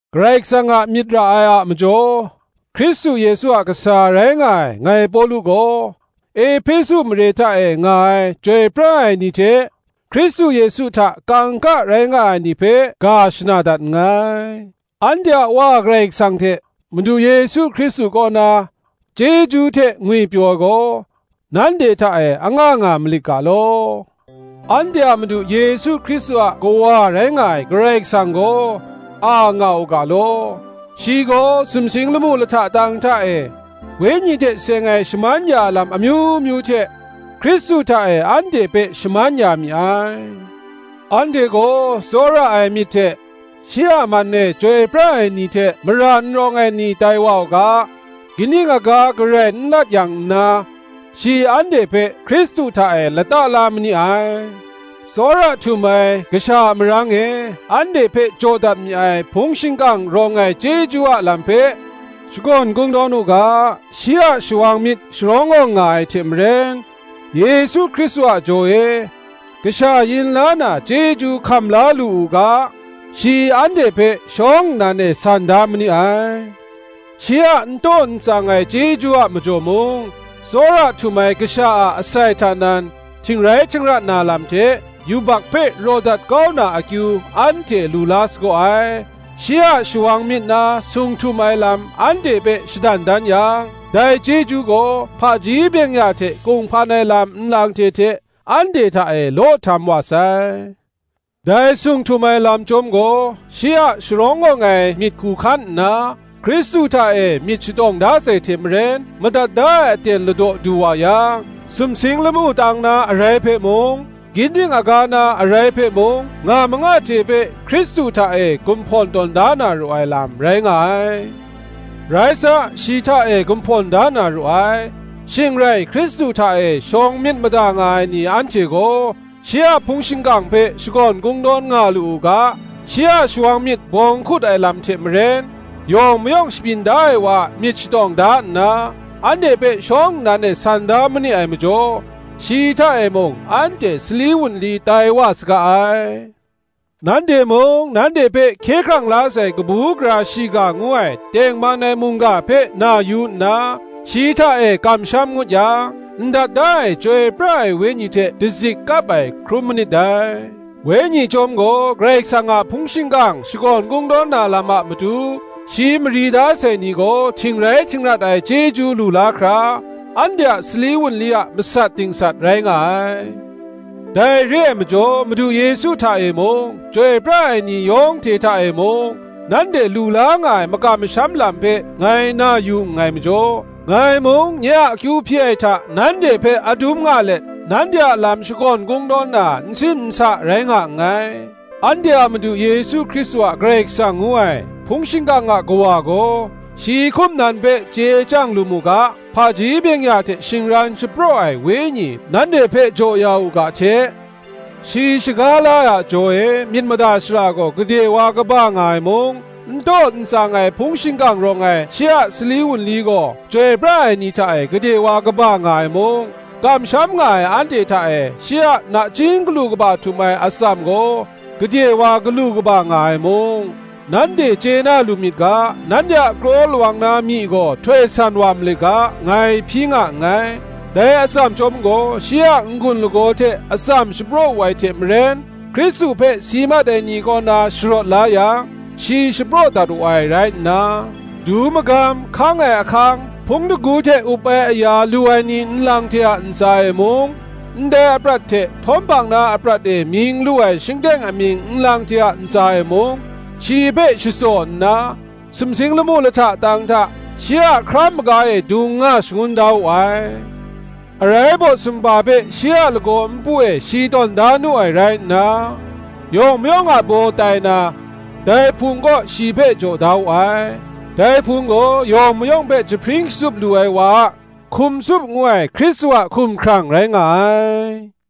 Karai Kasang a myit ra ai a majaw, Hkristu Yesu a kasa rai nga ai, ngai Pawlu gaw, Ehpesu mare hta e nga ai chyoi pra ai ni hte, Hkristu Yesu hta kangka rai nga ai ni hpe, ga shana dat nngai. Anhte a Wa Karai Kasang hte Madu Yesu Hkristu kaw na, chyeju hte ngwipyaw ai gaw, nanhte hta e anga nga malit ga law. Anhte a Madu Yesu Hkristu a Kawa rai nga ai Karai Kasang gaw, a nga u ga law: shi gaw sumsing lamu lahta tang hta e, Wenyi hte seng ai shaman ya ai lam amyu myu hte, Hkristu hta e anhte hpe shaman ya mi ai: anhte gaw tsawra ai myit hte, shi a man e chyoi pra ai ni hte mara n rawng ai ni tai wa u ga, ginding aga garai n lat yang nna, shi anhte hpe Hkristu hta e lata la ma ni ai. Tsawra htum ai Kasha a marang e, anhte hpe jaw dat mi ai hpung shingkang rawng ai chyeju a lam hpe shakawn kungdawn u ga, shi a shawang myit sharawng awng nga ai hte maren, Yesu Hkristu a jaw e, kasha yin la na chyeju hkam la lu u ga, shi anhte hpe shawng nnan e san da ma ni ai. Shi a n taw n tsang ai chyeju a majaw mung, tsawra htum ai Kasha a asai hta nan, htingrai htingrat na lam hte, yubak hpe raw dat kau na akyu, anhte lu la sagaw ai: shi a shawang myit na sung htum ai lam anhte hpe shadan dan yang, dai chyeju gaw hpaji byeng-ya hte kunghpan ai lam nlang hte hte, anhte hta e law htam wa sai: dai sung htum ai lam chyawm gaw, shi a sharawng awng ai myit hku hkan nna, Hkristu hta e myit shatawng da sai hte maren, madat da ai aten ladaw du wa yang, sumsing lamu tang na arai hpe mung, ginding aga na arai hpe mung, nga manga hte hpe Hkristu hta e gumhpawn tawn da na ru ai lam, rai nga ai. Rai sa, shi hta e gumhpawn da na ru ai: shing rai Hkristu hta e shawng myit mada nga ai ni anhte gaw, shi a hpung shingkang hpe shakawn kungdawn nga lu u ga, shi a shawang myit bawng hkut ai lam hte maren, yawng mayawng shabyin da ai wa a myit shatawng da nna, anhte hpe shawng nnan e san da ma ni ai majaw, shi hta e mung anhte sali wunli tai wa saga ai. Nanhte mung, nanhte hpe hkye hkrang la sai kabu gara shiga ngu ai tengman ai mungga hpe na yu nna, shi hta e kamsham ngut yang, ndat da ai Chyoi pra ai Wenyi hte dazik kap ai, hkrum manit dai: Wenyi chyawm gaw, Karai Kasang a hpung shingkang shakawn kungdawn na lam a matu, shi mari da sai ni gaw htingrai htingrat ai chyeju lu la hkra, anhte a sali wunli a masat dingsat rai nga ai. Dai re ai majaw, Madu Yesu hta e mung, chyoi pra ai ni yawng hte hta e mung, nanhte lu nga ai makam masham lam hpe ngai na yu nngai majaw, ngai mung, nye a akyu hpyi ai hta nanhte hpe adum nga let, nanhte a lam shakawn kungdawn na, n sim n sa rai nga nngai. Anhte a Madu Yesu Hkristu a Karai Kasang ngu ai, hpung shingkang a Kawa gaw, shi hkum nan hpe chye chyang lu mu ga, hpaji byeng-ya hte shingran shapraw ai Wenyi nanhte hpe jaw ya u ga hte; shi shaga la ai a jaw e myit mada shara gaw gade wa kaba nga ai mung; n taw n tsang ai hpung shingkang rawng ai shi a sali wunli gaw chyoi pra ai ni hta e gade wa kaba nga ai mung; kamsham nga ai anhte hta e shi a nachying galu kaba htum ai atsam gaw, gade wa galu kaba nga ai mung, nanhte chye na lu myit ga, nanhte a kraw lawang na myi gaw htoi san wa malit ga, ngai hpyi nga nngai. Dai atsam chyawm gaw, shi a n-gun lagaw hte atsam shapraw wu ai hte maren, Hkristu hpe si mat ai ni kaw na sharawt la yang, shi shapraw dat wu ai rai nna, du magam, hkang ai ahkang, hpung shingkang hte up ai aya lu ai ni nlang hte a ntsa e mung, ndai aprat hte htawm hpang na aprat e mying lu ai shingteng amying nlang hte a ntsa e mung, shi hpe shatsaw nna, sumsing lamu lahta tang hta, shi a hkra maga e dung nga shagun da wu ai. Arai baw sumhpa hpe shi a lagaw npu e shi tawn da nu ai rai nna, yawng mayawng a baw tai na, dai Hpung kaw shi hpe jaw da wu ai: dai Hpung gaw, yawng mayawng hpe jahpring shatsup lu ai wa a hkum tsup ngu ai Hkristu a hkumhkrang rai nga ai.